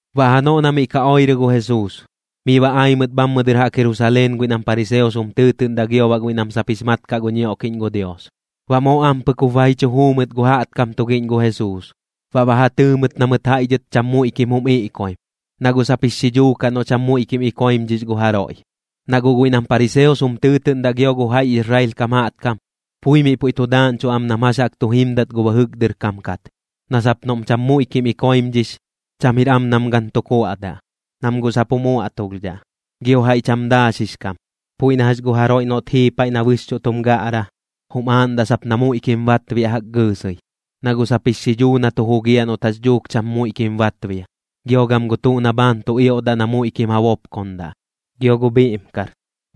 Baꞌ janoꞌ na miꞌ ka oirɨ gu Jesuus, miꞌ ba ai mɨt bhammɨ dɨr jaꞌk Jerusaleen guiꞌ nam pariseos jum tɨɨtɨꞌndaꞌ gio baꞌ guiꞌ nam sap jix mat kaꞌ gu ñioꞌkiꞌñ gu Dios. Baꞌ moo ampɨk jup ba ji chu juu mɨt gu jaꞌtkam tugiꞌñ gu Jesuus, baꞌ ba ja tɨɨ mɨt na mɨt jaiꞌ dhɨt cham muiꞌkim jum iꞌkoim, na guꞌ sap jix xidhuu kaꞌ noꞌ cham muiꞌkim ikoimdhix gu jaroiꞌ. Na guꞌ guiꞌ nam pariseos jum tɨɨtɨꞌndaꞌ gio gu jaiꞌ Israel kam jaꞌtkam, pui miꞌ puiꞌ tu daaꞌñchuꞌ am nam jax jaꞌk tu jimdat gu bɨjɨk dɨr kam kat, na sap noꞌm cham muiꞌkim ikoimdhix, cham jir am nam gan tu kuaꞌdaꞌ, nam guꞌ sap jum uaꞌtulhdhaꞌ. Gio jaiꞌ cham daaxix kam, puiꞌ na jax gu jaroiꞌ noꞌt jii paiꞌ na bɨxchuꞌ tum gaꞌra, jum aaꞌndaꞌ sap na muiꞌkim batbiaꞌ jaꞌk gɨɨsɨi, na guꞌ sap jix xidhuu na tu jugiaꞌ noꞌt jax dhuuk cham muiꞌkim batbia. Gio gam gu tuꞌ na bhaan tu ioꞌdaꞌ na muiꞌkim ja bopkondaꞌ, gio gu bhiꞌmkar,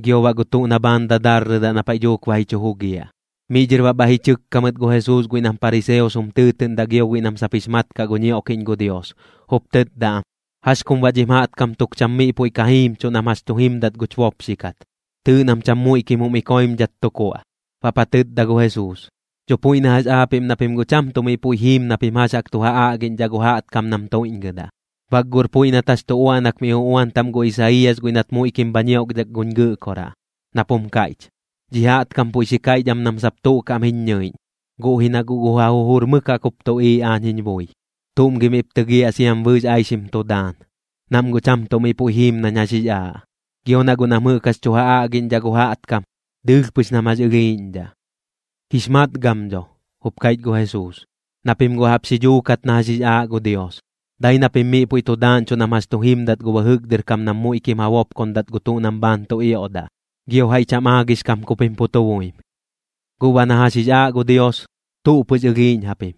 gio baꞌ gu tuꞌ na bhaan dadarrɨdaꞌ na paiꞌ dhuuk ba ji chu jugiaꞌ. Miꞌ dhɨr baꞌ bhaiꞌ ji chɨkka mɨt gu Jesuus guiꞌ nam pariseos jum tɨɨtɨꞌndaꞌ gio guiꞌ nam sap jix mat kaꞌ gu ñioꞌkiꞌñ gu Dios, jup tɨtda am: ―¿Jax kum baꞌ dhim jaꞌtkam tuk cham miꞌ puiꞌ ka jimchuꞌ nam jax tu jimdat guch bopxikat? Tɨɨꞌ nam cham muiꞌkim jum iꞌkoimdhat tu kuaꞌ. Baꞌp ja tɨtda gu Jesuus: ―Dho puiꞌ na jax aapiꞌm na pim guꞌ cham tuꞌ miꞌ puiꞌ jiim na pim jax jaꞌk tu ja aꞌgiꞌñdhaꞌ gu jaꞌtkam nam tuiꞌñgɨdaꞌ. Bak guꞌr puiꞌ nat jax tu uaꞌnak miꞌ uꞌuan taꞌm gu Isaiiyas guiꞌ nat muiꞌkim bha ñioꞌkdhak guñ Gɨꞌkoraꞌ, nap jum kaiꞌch: Dhi jaꞌtkam puiꞌ xi kaiꞌch am nam sap tuꞌ kaꞌm jiñ ñɨiꞌñ, guꞌ ji na guꞌ gu ja jujur mɨk jaꞌk jup tuꞌiiꞌ aañ jiñ bui. ¿Tuꞌm gi miꞌp tɨgiaꞌ siam bɨɨx aixim tu daan? Nam guꞌ cham tuꞌ miꞌ puiꞌ jiim nañ jax jix aaꞌ, gio na guꞌ nam jɨꞌk jax tu ja aꞌgiꞌñdhaꞌ gu jaꞌtkam, dɨɨlh pɨx nam jax ɨlhiiꞌñdhaꞌ. ’Jix matgam dho ―jup kaiꞌch gu Jesuus―, na pim guꞌ jaꞌp xi dhuukat na jax jix aaꞌ gu Dios. Dai na pim miꞌ puiꞌ tu daaꞌñchuꞌ nam jax tu jimdat gu bɨjɨk dɨr kam kat nam muiꞌkim ja bopkondat gu tuꞌ nam bhaan tu ioꞌdaꞌ, gio jaiꞌ cham aagix kam ku pim pu tu buim. ’Guꞌ baꞌ na jax jix aaꞌ gu Dios, tuꞌ pɨx ɨlhiiꞌñ japim.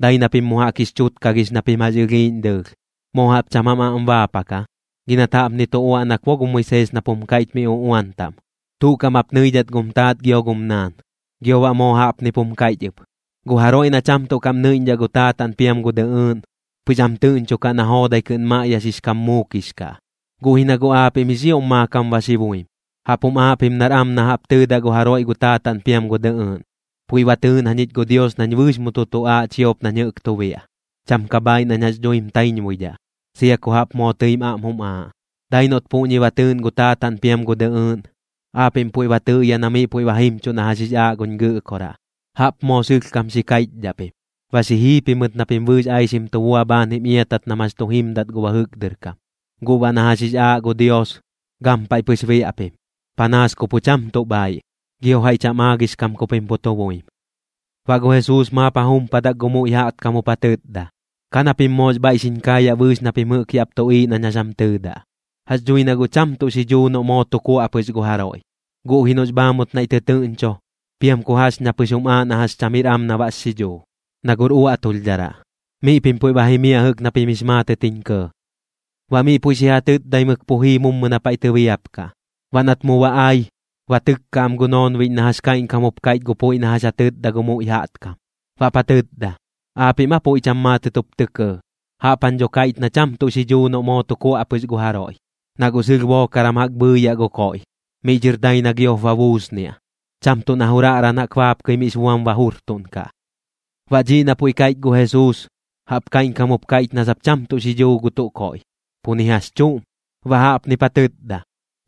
Dai na pim mu jaꞌk jix chutkagix na pim jax ɨlhiiꞌñ dɨɨlh. ¿Moo jaꞌp cham jam aꞌm baapak aa? Gi nat jaꞌpni tu uaꞌnak bo gu Moisees nap jum kaiꞌch miꞌ uꞌuan taꞌm: “Tuꞌ kaꞌm jap nɨidhat gum taat gio gum naan.” Gio baꞌ moo jaꞌpnip jum kaiꞌch ɨp: “Gu jaroiꞌ na cham tuꞌ kaꞌm nɨiꞌñdhaꞌ gu taataꞌn piam gu dɨꞌɨɨꞌn, pɨx am tɨꞌñchokaꞌ na joodai kɨꞌn maꞌyaxix kam muukix kaꞌ.” Guꞌ ji na guꞌ aapiꞌm jix ioꞌm maakam ba xi buim, jaꞌp jum aaꞌ pim nar am na jaꞌp tɨɨdaꞌ gu jaroiꞌ gu taataꞌn piam gu dɨꞌɨɨꞌn: “Puiꞌ ba tɨɨꞌn jañich gu Dios nañ bɨɨx mu tu tuꞌaaꞌ chiop nañ jɨꞌk tu biaꞌ. Cham ka bhaaiꞌ nañ jax dhuim taiñbuidhaꞌ, sia ku jaꞌp moo tɨim aꞌm jum aaꞌ.” Dai noꞌt puꞌñi ba tɨɨꞌn gu taataꞌn piam gu dɨꞌɨɨꞌn, aapiꞌm puiꞌ ba tɨꞌyaꞌ na miꞌ puiꞌ ba jimchuꞌ na jax jix aaꞌ guñ Gɨꞌkoraꞌ, jaꞌp moo sɨlhkam xi kaiꞌchdhaꞌ pim. Ba xi jii pimɨt na pim bɨɨx aixim tu bua bhaan jim iatat nam jax tu jimdat gu bɨjɨk dɨr kam. Guꞌ baꞌ na jax jix aaꞌ gu Dios, gampaiꞌ pɨx biaꞌ pim, panaas ku pu cham tuꞌ bhaiꞌ, gio jaiꞌ cham aagix kam ku pim pu tu buim. Baꞌ gu Jesuus maap ja jumpadak gu muiꞌ jaꞌtkam jup ja tɨtda: ―Ka na pim moox bhaiꞌ xiñ kaayaꞌ bɨɨx na pim jɨꞌk yaꞌp tuꞌiiꞌ nañ jax jam tɨɨdaꞌ. Jax dhui na guꞌ cham tuꞌ xidhuu noꞌ moo tu kuaꞌ pɨx gu jaroiꞌ, guꞌ ji noꞌx bhaamut naiꞌ tɨtɨɨꞌñcho, piam ku jax ña pɨx jum aaꞌ na jax cham jir am na baꞌx xidhuu, na guꞌr uaꞌtulhdharaꞌ. Miꞌ pim puiꞌ ba jimiaꞌ jɨꞌk na pim jix maatɨt jiñ kɇɇ. Baꞌ miꞌ puiꞌ xi ja tɨtdaimɨk pu jii mummu na paiꞌ tɨbiapkaꞌ. Baꞌ nat mu ba ai, ba tɨkka am gu noonbiꞌñ na jax kaiꞌñkam jup kaiꞌch gu puiꞌ na jax ja tɨtda gu muiꞌ jaꞌtkam. Baꞌp ja tɨtda: ―¿Aapiꞌm aa puiꞌ cham maatɨt jup tɇ kɇɇ? Jaꞌp jañ dho kaiꞌch na cham tuꞌ xidhuu noꞌ moo tu kuaꞌ pɨx gu jaroiꞌ, na guꞌ sɨlh bookaran jaꞌk bhɨɨyaꞌ gu koiꞌ, miꞌ dhɨr dai na giop ba buusniaꞌ, cham tuꞌ na juraꞌran jaꞌk baapkɨi miꞌx buam ba jurtuꞌnkaꞌ. Baꞌ dhiꞌ na puiꞌ jɨꞌ kaiꞌch gu Jesuus, jaꞌp kaiꞌñkam jup kaiꞌch na sap cham tuꞌ xidhuu gu tuꞌ koiꞌ, pu ni jax chuꞌm. Baꞌ jaꞌpnip ja tɨtda: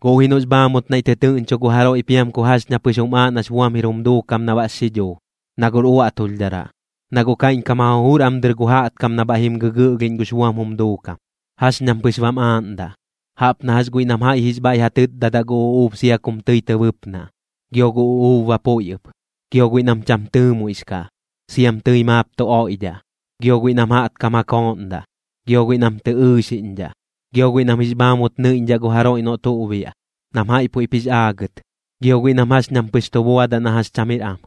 ―Guꞌ ji noꞌx bhaamut naiꞌ tɨtɨɨꞌñchu gu jaroiꞌ piam ku jax ña pɨx jum aaꞌ nax buam jir jum duukam na baꞌx xidhuu, na guꞌr uaꞌtulhdharaꞌ. Na guꞌ kaiꞌñkam ja jujur am dɨr gu jaꞌtkam na bhaiꞌ jim gɨgɨꞌlhiꞌñ gux buam jum duukam, jax ñam pɨx bam aaꞌndaꞌ, jaꞌp na jax guiꞌ nam jaiꞌ jix bhaiꞌ ja tɨtdadaꞌ gu uꞌuub sia kum tɨi tɨ bɨpnaꞌ, gio gu uꞌuub ba puiꞌ ɨp. Gio guiꞌ nam cham tɨɨmuiꞌx kaꞌ, siam tɨi maap tu oiꞌdhaꞌ. Gio guiꞌ nam jaꞌtkam ja kooꞌndaꞌ. Gio guiꞌ nam tɨ ɨɨxiꞌñdhaꞌ. Gio guiꞌ nam jix bhaamut nɨiꞌñdhaꞌ gu jaroiꞌ noꞌ tuꞌ biaꞌ, nam jaiꞌ puiꞌp jix aagɨt. Gio guiꞌ nam jax ñam pɨx tu buadaꞌ na jax cham jir am.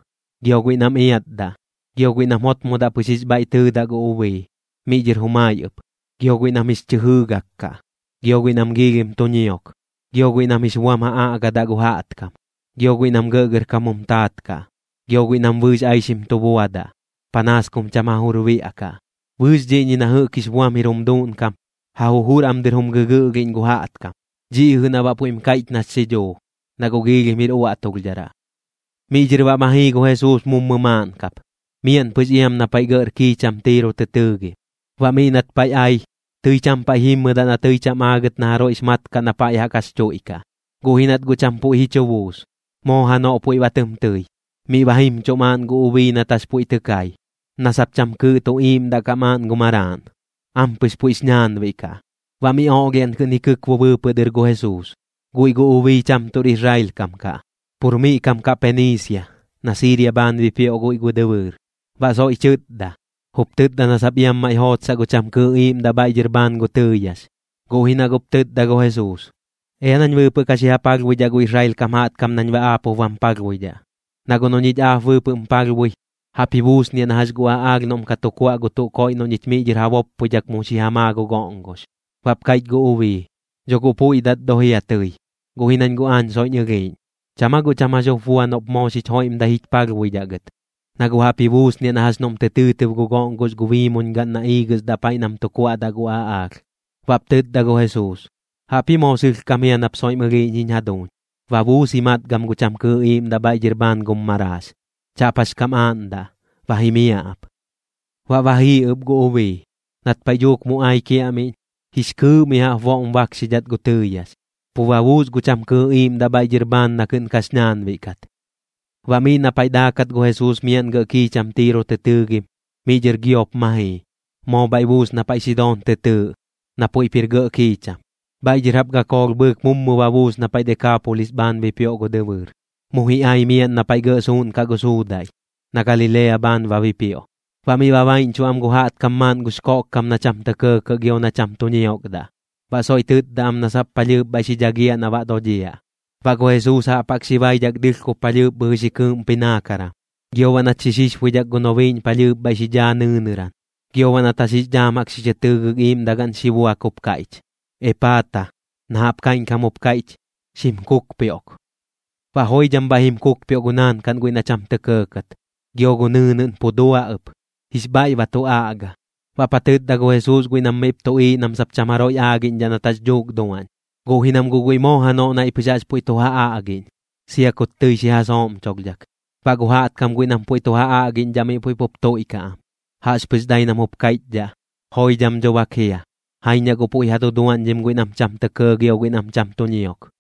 Gio guiꞌ nam iatdaꞌ. Gio guiꞌ nam jotmodaꞌ pɨx jix bhaiꞌ tɨɨdaꞌ gu ubii, miꞌ dhɨr jumai ɨp. Gio guiꞌ nam jix chɨ jɨɨgak kaꞌ. Gio guiꞌ nam giilhim tu ñiok. Gio guiꞌ nam jix buam ja aꞌgadaꞌ gu jaꞌtkam. Gio guiꞌ nam gɇꞌgɇrkam jum taat kaꞌ. Gio guiꞌ nam bɨɨx aixim tu buadaꞌ, panaas kum cham ja jujur biaꞌkaꞌ. Bɨɨx dhiꞌñi na jɨꞌk jix buam jir jum duuꞌnkam, ja jujur am dɨr jum gɨgɨꞌlhiꞌñ gu jaꞌtkam. Dhiꞌ ji na baꞌ puiꞌm kaiꞌch nax xidhuu, na guꞌ giilhim jir uaꞌtulhdharaꞌ. Miꞌ dhɨr baꞌ ma jii gu Jesuus mummu maaꞌn kap, miaꞌn pɨx iam na paiꞌ gɇꞌr kiicham Tiiro tɨ tɨɨgim. Baꞌ miꞌ nat paiꞌ ai, tɨi cham paiꞌ jimmɨdaꞌ na tɨi cham aagɨt na jaroiꞌx mat kaꞌ na pa jaꞌk jax chuiꞌkaꞌ. Guꞌ ji nat guꞌ cham puiꞌ ji chu buus, moo janoꞌ puiꞌ ba tɨm tɨi. Miꞌ ba jimchuꞌ maaꞌn gu ubii nat jax puiꞌ tɨ kai, na sap cham kɨɨꞌ tu iiꞌmdaꞌ kaꞌ maaꞌn gu maraaꞌn, ampɨx puiꞌx ñaanbiꞌ kaꞌ, baꞌ miꞌ oꞌlhiaꞌn kɨꞌn ji kɨkbu bɨɨpɨꞌ dɨr gu Jesuus. Guiꞌ gu ubii cham tuꞌr Israel kam kaꞌ, pur miꞌ kam kaꞌ Peniisia, na Siiria bhaan bipioꞌ guiꞌ gu dɨbɨɨr. Baꞌ soiꞌ xi chɨtda, jup tɨtda na sap iam maiꞌ jootsaꞌ gu cham kɨɨꞌ iiꞌmdaꞌ bhaiꞌ dhɨr bhaan gu tɨɨyax. Guꞌ ji na guꞌp tɨtda gu Jesuus: ―Ea nañ bɨɨpɨꞌ ka xi ja palhbuidhaꞌ gu Israel kam jaꞌtkam nañ baꞌ aap jup bam palhbuidhaꞌ. Na guꞌ noꞌ ñich aap bɨɨpɨꞌm palhbui, jaꞌp ji buusniaꞌ na jax gu aꞌaalh noꞌm ka tu kuaꞌ gu tuꞌ koiꞌ noꞌ ñich miꞌ dhɨr ja boppoidhak mu xi ja maa gu goꞌngox. Baꞌp kaiꞌch gu ubii: ―Dho guꞌ puiꞌ dat do jia tɨi, guꞌ ji nañ guꞌ aañ soiꞌñ ɨlhiiꞌñ. ¿Cham aa guꞌ cham jax jup bua noꞌp moo xich joiꞌmdai jich palhbuidhaꞌ gɨt? Na guꞌ jaꞌp ji buusniaꞌ na jax noꞌm tɨ tɨɨtɨb gu goꞌngox gu biimuñgaꞌn na iigɨsdaꞌ paiꞌ nam tu kuaꞌdaꞌ gu aꞌaalh. Baꞌp tɨtda gu Jesuus: ―Jaꞌpji moo sɨlhkam jia nap soiꞌm ɨlhiiꞌñ jiñ jaduuñ. Ba buus ji matgam gu cham kɨɨꞌ iiꞌmdaꞌ bhaiꞌ dhɨr bhaan gum maraax. Chaꞌp jax kam aaꞌndaꞌ, ba jimiaꞌ ap. Baꞌ ba jii ɨp gu ubii. Nat paiꞌ dhuuk mu ai kiaꞌmiꞌñ, jix kɨɨꞌ mi jaꞌp boꞌm bakxidhat gu tɨɨyax, pu ba buus gu cham kɨɨꞌ iiꞌmdaꞌ bhaiꞌ dhɨr bhaan na kɨꞌn kax ñaanbiꞌ kat. Baꞌ miꞌ na paiꞌ daakat gu Jesuus miaꞌn gɇꞌ kiicham Tiiro tɨ tɨɨgim, miꞌ dhɨr giop ma jii, moo bhaiꞌ buus na paiꞌ Sidoon tɨ tɨɨꞌ, na puiꞌp jir gɇꞌ kiicham. Bhaiꞌ dhɨr jaꞌp gakoolh bhɨɨk mummu ba buus na paiꞌ Dekaapolis bhaan bipioꞌ gu dɨbɨɨr. Mu ji ai miaꞌn na paiꞌ gɇꞌ suuꞌnkaꞌ gu suudaiꞌ, na Galilea bhaan ba bipioꞌ. Baꞌ miꞌ ba baiꞌñchuꞌ am gu jaꞌtkam maaꞌn gux koꞌkkam na cham tɇ kɇɇkɇꞌ gio na cham tu ñiokdaꞌ, baꞌ soiꞌ tɨtda am na sap palhɨɨp bhaiꞌ xi dhagiaꞌ na baꞌ dodhiaꞌ. Baꞌ gu Jesuus jaꞌp jaꞌk xi baidhak dɨɨlhkob palhɨɨp bhɨjɨ xi kɨɨꞌmpi naankaran, gio baꞌ nat xi xixbuidhak gu nobiiꞌñ palhɨɨp bhaiꞌ xi dhaa nɨɨnɨran. Gio baꞌ nat jax jix dhaam jaꞌk xi chɨ tɨɨgɨk iiꞌmdagaꞌn xi buak jup kaiꞌch: ―¡Epaata! ―na jaꞌp kaiꞌñkam jup jum kaiꞌch: ¡Xim kukpioꞌk! Baꞌ joidham bhaiꞌ jim kukpioꞌ gu naankaꞌn guiꞌ na cham tɇ kɇɇkat, gio gu nɨɨnɨꞌn pu dua ɨp, jix bhaiꞌ ba tu aꞌga. Baꞌp ja tɨtda gu Jesuus guiꞌ nam miꞌp tuꞌiiꞌ nam sap cham jaroiꞌ aagiꞌñdhaꞌ nat jax dhuuk duaꞌñ, guꞌ ji nam guꞌ guiꞌ moo janoꞌ naiꞌ pɨx jaꞌx puiꞌ tu ja aꞌgiꞌñ, sia kut tɨi xi ja sooꞌmcholhdhak. Baꞌ gu jaꞌtkam guiꞌ nam puiꞌ tu ja aꞌgiꞌñdhaꞌ miꞌ puiꞌ pup tuiꞌkaꞌ am, jaꞌxpɨx dai nam jup kaiꞌchdhaꞌ: ―¡Joidham dho bak jia! Jaiñ na guꞌ puiꞌ ja duduaꞌñdhim guiꞌ nam cham tɇ kɇɇ gio guiꞌ nam cham tu ñiok.